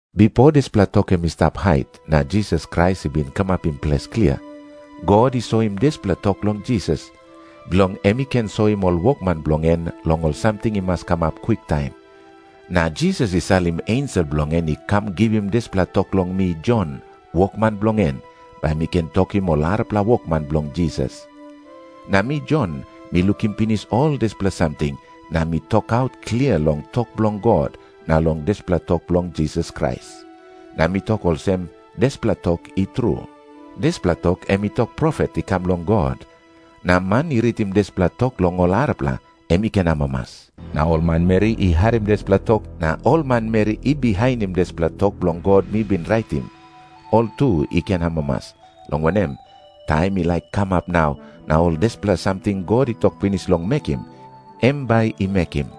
Bipo dispela tok em i stap hait, na Jisas Krais i bin kamapim ples klia. God i soim dispela tok long Jisas, bilong em i ken soim ol wokman bilong en long ol samting i mas kamap kwiktaim. Na Jisas i salim ensel bilong en i kam givim dispela tok long mi Jon, wokman bilong en, bai mi ken tokim ol arapela wokman bilong Jisas. Na mi Jon, mi lukim pinis ol dispela samting, na mi tokaut klia long tok bilong God, na long dispela tok bilong Jisas Krais. Na mi tok olsem, dispela tok i tru. Dispela tok em i tok profet i kam long God, na man i ritim dispela tok long ol arapela, em i ken amamas. Na ol manmeri i harim dispela tok na ol manmeri i bihainim dispela tok bilong God mi bin raitim, ol tu i ken amamas, long wanem, taim i laik kamap nau, na ol dispela samting God i tok pinis long mekim, em bai i mekim.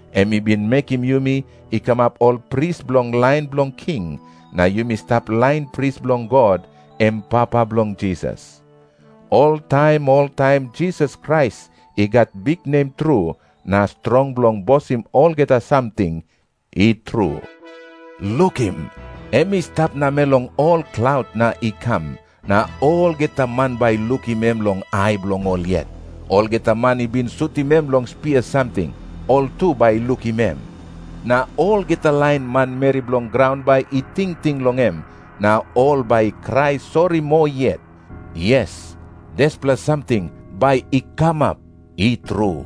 Em i bin mekim yumi i kamap ol pris bilong lain bilong king, na yumi stap lain pris bilong God, em Papa bilong Jisas. Oltaim oltaim Jisas Krais i gat biknem tru na strong bilong bosim olgeta samting. I tru. Lukim. Em i stap namel long ol klaut na i kam, na olgeta man bai i lukim em long ai bilong ol yet. Olgeta man i bin sutim em long spia samting, ol tu bai i lukim em. Na olgeta lain manmeri bilong graun bai i tingting long em, na ol bai i krai sori moa yet. Yes, dispela samting bai i kamap. I tru.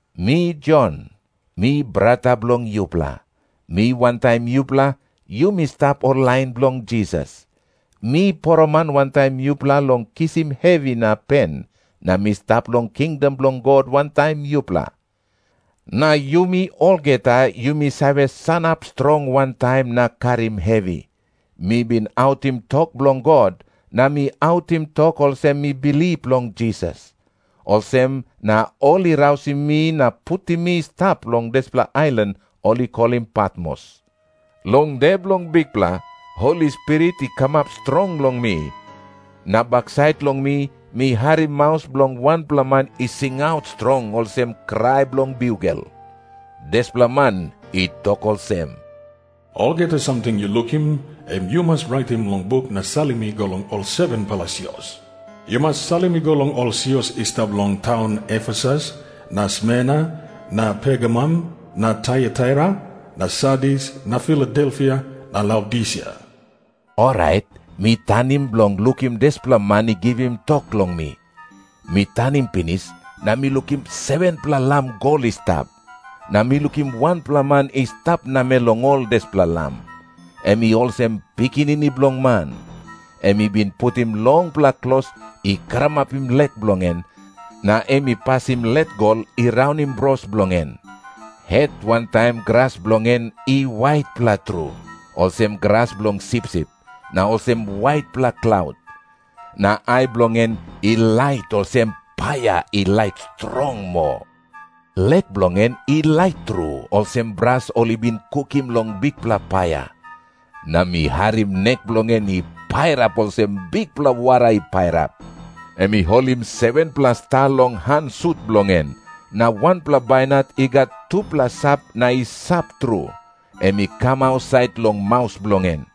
Mi Jon, mi brata bilong yupela. Mi wantaim yupela, yumi stap ol lain bilong Jisas. Mi poroman wantaim yupela long kisim hevi na pen, na mi stap long kingdom bilong God wantaim yupela. Na yumi olgeta yumi save sanap strong wantaim na karim hevi. Mi bin autim tok bilong God, na mi autim tok olsem mi bilip long Jisas. Olsem na ol i rausim mi na putim mi i stap long dispela ailan ol i kolim Patmos. Long de bilong Bikpela, Holi Spirit i kamap strong long mi, na baksait long mi mi harim maus bilong wanpela man i singaut strong, olsem krai bilong biugel. Dispela man i tok olsem, "Olgeta samting yu lukim, em yu mas raitim long buk na salim i go long ol 7-pela sios. Yu mas salim i go long ol sios i stap long taun Efesus na Smerna na Pergamum na Taiataira na Sardis na Filadelfia na Laodisia." Orait mi tanim bilong lukim dispela man i givim tok long mi. Mi tanim pinis, na mi lukim 7-pela lam gol i stap. Na mi lukim wanpela man i stap namel long ol dispela lam. Em i olsem Pikinini Bilong Man. Em i bin putim longpela klos i karamapim lek bilong en, na em i pasim let gol i raunim bros bilong en. Het wantaim gras bilong en i waitpela tru, olsem gras bilong sipsip, na olsem waitpela klaut. Na ai bilong en i lait olsem paia i lait strong moa. Lek bilong en i lait tru, olsem bras ol i bin kukim long bikpela paia. Na mi harim nek bilong en i pairap olsem bikpela wara i pairap. Em i holim 7-pela sta long han sut bilong en. Na wanpela bainat i gat tupela sap na i sap tru, em i kam ausait long maus bilong en.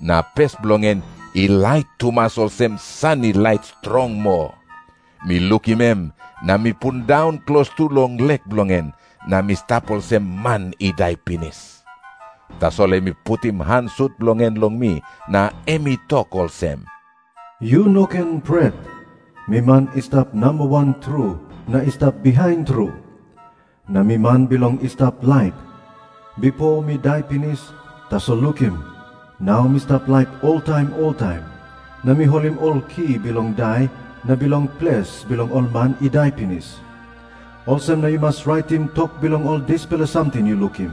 Na pes bilong en i lait tumas, olsem san i lait strong moa. Mi lukim em na mi pundaun klostu long lek bilong en, na mi stap olsem man i dai pinis. Tasol em i putim han sut bilong en long mi, na em i tok olsem, "Yu no ken pret. Mi man i stap namba wan tru na i stap bihain tru. Na mi man bilong i stap laip. Bipo mi dai pinis, tasol lukim, nau mi stap laip oltaim oltaim. Na mi holim ol ki bilong Dai na bilong Ples bilong ol man i dai pinis. Olsem na yu mas raitim tok bilong ol dispela samting yu lukim,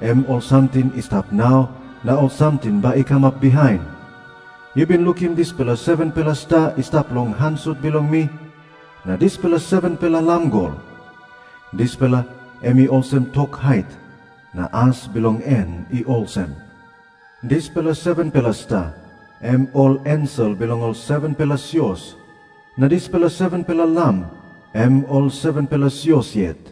em ol samting i stap nau na ol samting bai i kamap bihain. Yu bin lukim dispela 7-pela sta i stap long han sut bilong mi, na dispela 7-pela lam gol. Dispela em i olsem tok hait, na as bilong en i olsem. Dispela 7-pela sta, em ol ensel bilong ol 7-pela sios. Na dispela 7-pela lam, em ol 7-pela sios yet."